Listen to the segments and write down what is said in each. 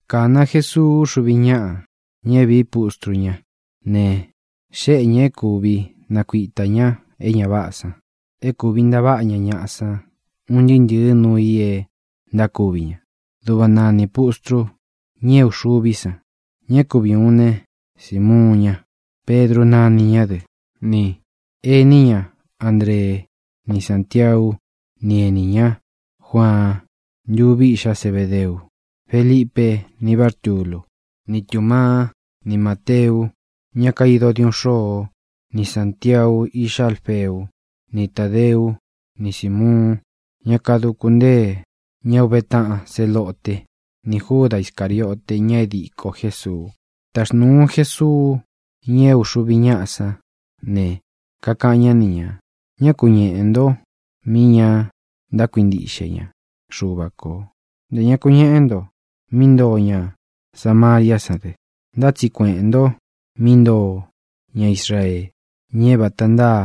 Kāna Jesuu úxuvi ñáꞌa, ña é vīí pustru ñá ne, xéꞌe ñā é kuvi nakuitā ña é ña váꞌā san, é kūvi ntaváꞌa ña ñaꞌa san un ntɨɨ́ ntɨ̄ɨ́ nuu i é ntákuvi ña. Duꞌva nanī pustru, ña é uxuví san: ña é kuvi ūun ne, Simuun ña (Pedru nani ñá dɨ), ni enī ñá, Andree; ni Sāntiaú, ni enī ñá, Juaan, ntuvi íꞌxá Zebedeu; Felipe, ni Bártulu, ni Tūmaá, ni Māteu, ñá kaido diuꞌun xôo; ni Sāntiau, iꞌxá Alfeú, ni Tādeú, ni Sīmuun, ñá kaduku ntée ña uve taꞌan Zelote, ni Júda Iscāriote, ña é dīko Jésuu. Taxnūu Jesuu ña é uxuvi ñáꞌa san ne, kakaꞌan ñá ni ñā: —Ñá ku ñeꞌē nto mi ña ntákuintiꞌxe ña Xuva kō; ntē ña ku ñeꞌé nto mí ntoo ña Samariá san dɨ. Ntá tsi kueꞌēn nto mí ntoo ña Israee, ña é vāta ntáa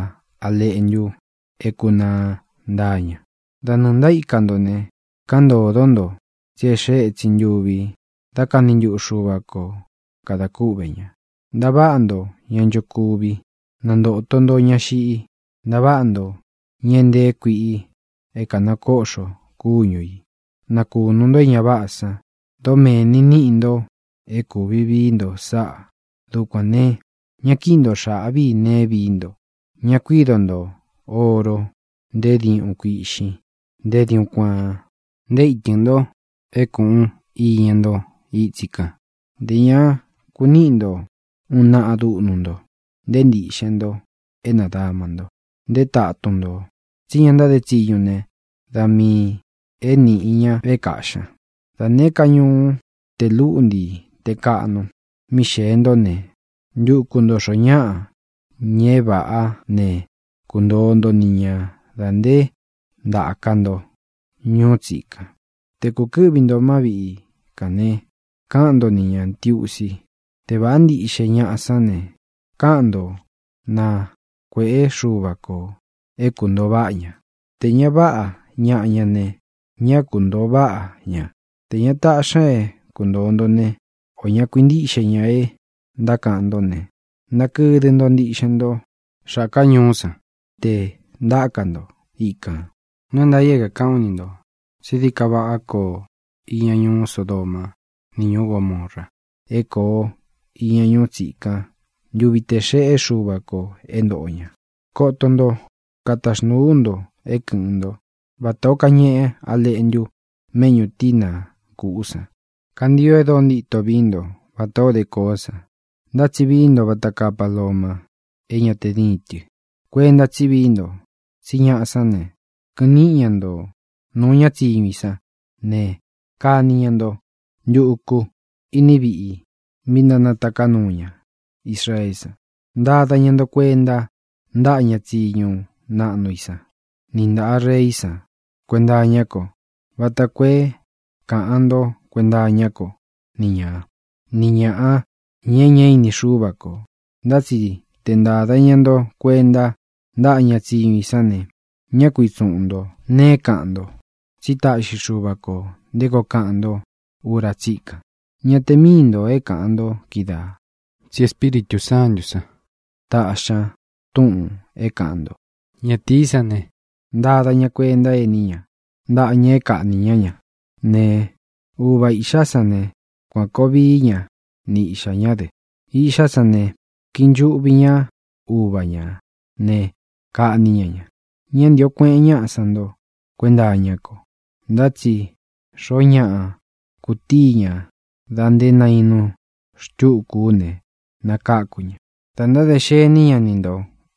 a leꞌntu é kunaa ntáa ña. Da nɨɨ̄ ntaíka nto ne, káꞌan ntōdó nto tsí é xee étsin ntuvi dá kani ntuꞌu Xuva ko kadā kúꞌvē ña. Ntaváꞌa nto ña nchokuvi; nantōto nto ña xiꞌi; ntaváꞌa nto ña é ntee kuiꞌi é kānakóꞌxo kúñu ī; nakūnu nto é ña váꞌā san. Dómēni níꞌi nto é kūvi vií nto sáꞌā. Dukuān ne, ña kíꞌi nto xāꞌví i nee é viī nto. ʼÑa kuído nto ōro, nté diuꞌun kuiꞌxin, nté diuꞌun kuaan, nté itɨ̄n nto é kūꞌun iña ntó itsi kān. Nté ña kuniꞌi nto uun naꞌa dúꞌnu nto, nté ntiꞌxen nto é nādama nto, nté tatun ntō, tsí ña ntáde tsiñu ne, da miī é nīꞌi ña é kaꞌxī ña. ʼDa nēé ka ñuú, tē lúꞌnti te kāꞌnu, mí xēe ntó ne, ntuku ntō xoó ñaꞌa, ña é vāꞌá ne, kuntoo nto ni ña dā nté ntāka nto ñuú tsikan. Te kūkɨ́ꞌvi ntō má viꞌi kān ne, káꞌan nto ni ñā Ntiusi. Te vāꞌá ntiꞌxe ñaꞌa sán ne, káꞌan nto, na kuēꞌé Xuva kō é kūntoo váꞌa ña. Tē ña váꞌa ñaꞌa ña ne, ñá kuntoo váꞌa ña. Tē ña taꞌxi ña é kuntōo nto ne, o ña kuintíꞌxe ña é ntákaꞌan ntó ne, nakɨdɨ nto ntiꞌxen nto xákā ñuú san te ntaka nto ikān. Nuu é ntaā i é kākaꞌán u ni ntō tsí dií ka váꞌa kōo iña ñuú Sodoma ni ñuú Gomora é kōo iña ñuú tsikan ntuvi tē xeꞌé Xuva kō é ntōꞌo ña. ʼ¡Koto nto! Kataxnūu ú nto é kɨ̄ꞌɨn ntó vatā ó kañeꞌe a léꞌntu méꞌñū tína kūꞌú san. Kantio e dóo ntíto víí nto vatā ó de koó san, ntá tsi vií nto vata kaa paloma, é ña te díin tɨ. Kuenta tsí vií nto, tsí ñaꞌa sán ne, kɨꞌɨn níꞌi ña nto nūu ña tsíñu i sán ne, kani ña nto ntuku iní viꞌi mi ntánataká nuu ña Israeé san. Ntada ña nto kuenta ntáꞌa ña tsiñu naꞌnu i san ni ntāꞌa reí san kuenta iñá ko vata koo é kāꞌan ntó kuenta iñá ko ni ña, ni ñāꞌa, ña e ñá ini Xúva kō. Ntá tsi te ntāda ña nto kuenta ntáꞌa ña tsiñu i sán ne, ñá ku itsuꞌun ntō nee é kāꞌan nto. Tsí taꞌxi Xuva kō nté koo kaꞌan ntó ura tsíkan. Ña te míi ntō é kāꞌan nto kídaā, tsi Espíritū Sántū san taꞌxi ña túꞌūn é kāꞌan nto. ʼÑatīí san ne, ntada ña kuenta éní ña ntaꞌa ñaꞌa e kaꞌní ña ña ne, uva īꞌxá san ne, kuan kōo vií ña ni iꞌxā ñá dɨ; iꞌxá san ne, kiꞌi nchuꞌvi ñá uva ñā ne, kaꞌní ña ña. Ñá ntīo kueꞌen ñaꞌa san nto kuenta iñá ko. Ntá tsi xoó ñaꞌa kutíi ña dā nté nainu xtuku ú ne, nakáku ña. Dā ntádē xení ña ni nto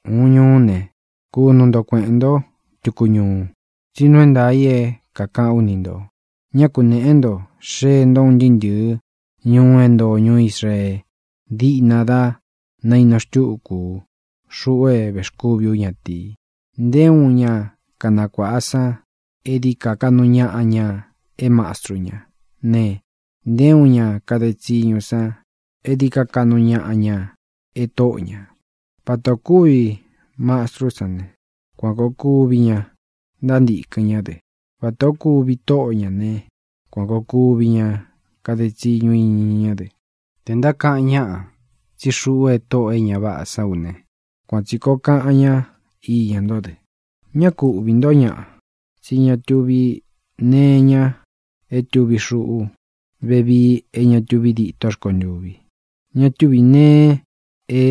ūun ñuú ne, kunu nto kueꞌēn ntó tuku ñuu. Tsí nuu é ntaā i é kākaꞌán u ni ntō, ñá kunēꞌé nto xee nto un ntɨɨ́ ntɨ̄ɨ́ ñuu é ntoo ñuú Israee díꞌna dá nainu xtúku ú, xuꞌu é vēxkúvi ú ñatīi. ʼNté uun ña kanakuāꞌa san é dií ka kaꞌnu ñaꞌa ña é mastru ñá ne, nté uun ña kade tsiñu san é dií ka kaꞌnu ñaꞌa ña e tóꞌo ñā. Vata ō kúvi mastrú san ne, kuan kōo kuvi ña ntántīkɨn ñá dɨ. Vata ō kúvi tóꞌo ñā ne, kuan kōo kuvi ña kade tsiñu iña ñá dɨ. Tē ntákaꞌan ñáꞌa tsí xuꞌú e tóꞌō e ña váꞌā sán u ne, kuan tsi kōo kaꞌan ñá iña ntó dɨ. ʼÑá ku uꞌvī ntó ñaꞌa. Tsí ña tuví nee iña é tuvi xuꞌú vevii é ña tuvi dîtó rkontûvi; ña túvī nee é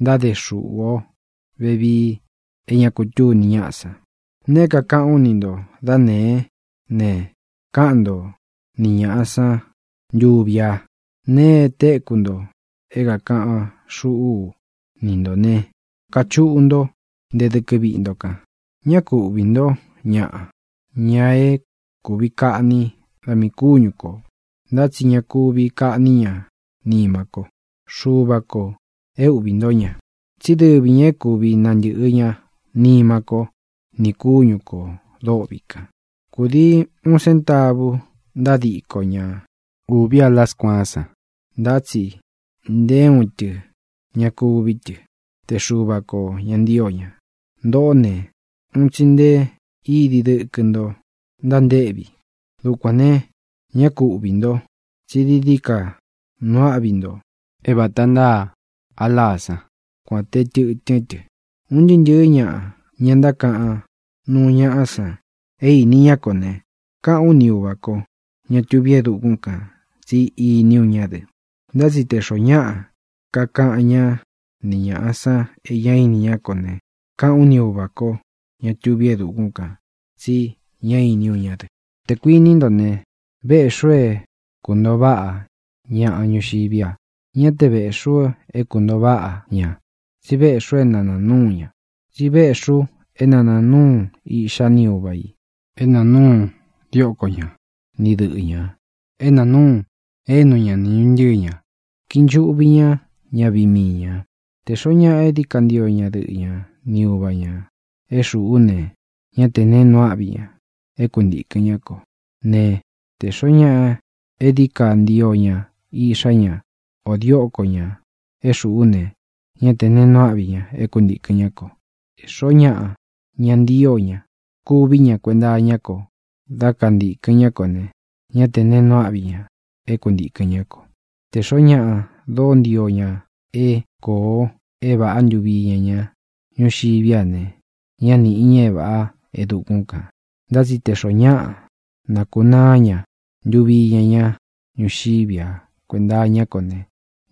ntáde xuꞌu o vevii é ña kutúni ñaꞌa san. Nēe é kākaꞌán u ni ntō dá nēé ne, káꞌan nto ni ñāꞌa sán ntuvi a. Nēe é tekú nto é kākaꞌan xúꞌu ú ni ntō ne, kachuꞌu ntó nte dɨkɨ viꞌi nto kan. Ñá ku uꞌvī ntó ñaꞌa, ña é kūvi kaꞌní da miī kúñu kō, ntá tsi ña kuvi kaꞌní ña nima ko. Xuva kō é uꞌvī ntó ña, tsí dɨvi ñā é kuvi nantɨ̄ꞌɨ ña nima kó nī kúñu kō dôꞌvi kan. ʼKūdii uun séntavu ntádiko ña uvi a láā skuaán san. Ntá tsi nté uun tɨ ña kuví tɨ, te Xuva kō ña ntío ña. Ntōꞌó ne, un tsi nté idi dɨkɨ nto ntántéꞌvi. Dukuān ne, ñá ku uꞌvī nto, tsí dií dií ka nuu áꞌvi nto é vāta ntáa a láā sán, kuān te tɨtɨ́n tɨ. ʼUn ntɨɨ́ ntɨ̄ɨ́ ñaꞌa, ña ntákaꞌan nuu ñaꞌa san e ini ña kó ne, káꞌān ú ni Uvā kó, ña tuví e dukún kān, tsí ini ú ña dɨ. Ntá tsi tē xoó ñaꞌa kakaꞌan ñá ni ñāꞌa san e ñá ini ñá ko ne, káꞌān ú ni Uvā kó, ña tuví e dukún kān, tsi ñá īni ú ña dɨ. ʼTē kuiní nto ne, véꞌxī u é kūntoo váꞌa ñaꞌa ñuxiví a. Ñá te vēꞌxí u é kūntoo váꞌa ña, tsi véꞌxī u é na nāa núu ña. Tsi véꞌxī u é na nāa núu iꞌxá ni uva ī, é nāa núu dióko ña ni dɨꞌɨ̄ ña, é nāa núu énu ña ni ñuntɨɨ ñā. Kiꞌi nchuꞌvi ña ñaviꞌi mii ñā. ʼTē xoó ñaꞌa é dií ka ntio ña dɨꞌɨ ña ni uva ñā é xūꞌú ne, ñá tē neé nuu áꞌvi ña é kuntīkɨn ñá ko. Ne, tē xoó ñaꞌa é dií ka ntio ña iꞌxá ña ō dióko ñā é xūꞌú ne, ñá tē neé nuu áꞌvi ña é kuntīkɨn ñá ko. Tē xoó ñaꞌa ña ntío ña kuví ña kuenta iñá ko dá kantīkɨn ñá ko ne, ñá tē neé nuu áꞌvi ña é kuntīkɨn ñá ko. Tē xoó ñaꞌa dóo ntio ña é koo é vāꞌá ntuvi iña ña ñuxiví a ne, ñá nīꞌi ña é vāꞌá e dukún kān. Ntá tsi tē xoó ñaꞌa nakunáa ña ntuvi iña ña ñuxiví a kuenta iñá ko ne,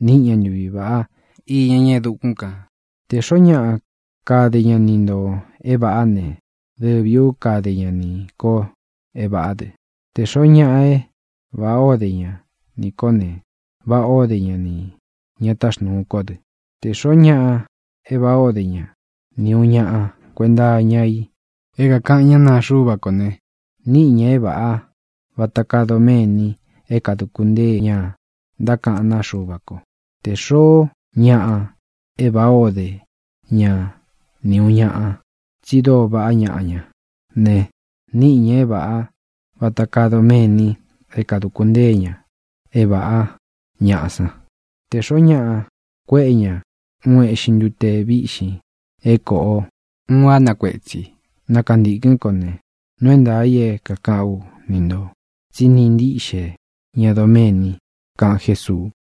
níꞌi ña ntuvi vāꞌá iña ña e dukún kān. ʼTē xoó ñaꞌa kade ña ni ntō é vāꞌá ne, dɨvī ú kade ña nī ko é vāꞌá dɨ. Tē xoó ñaꞌa e váꞌā ó de ña nī kó ne, váꞌā ó de ña nī ña táxnūu kó dɨ. Tē xoó ñaꞌa e váꞌā ó de ña ni ūun ñaꞌa kuenta iña i é kākaꞌan ñá naa Xuva kó ne, níꞌi ña é vāꞌá vata kaa doméni é kāduku ntée ña ntákaꞌán naa Xuva ko. Tē xoó ñaꞌa e váꞌā ó de ña ni ūun ñaꞌa, tsi dóo vaꞌá ñaꞌa ña ne, níꞌi ña é vāꞌá vata kaa doméni é kāduku ntée ña é vāꞌá ñaꞌa san. Tē xoó ñaꞌa kuéꞌe ña uun eꞌxin ntute vīꞌxin é kōꞌo uun á na kuetsi, na kantīkɨ́n ko ne, nuu é ntaā i é kākaꞌán u ni ntō tsí niꞌi ntiꞌxe ña doméni —kaꞌan Jésuu.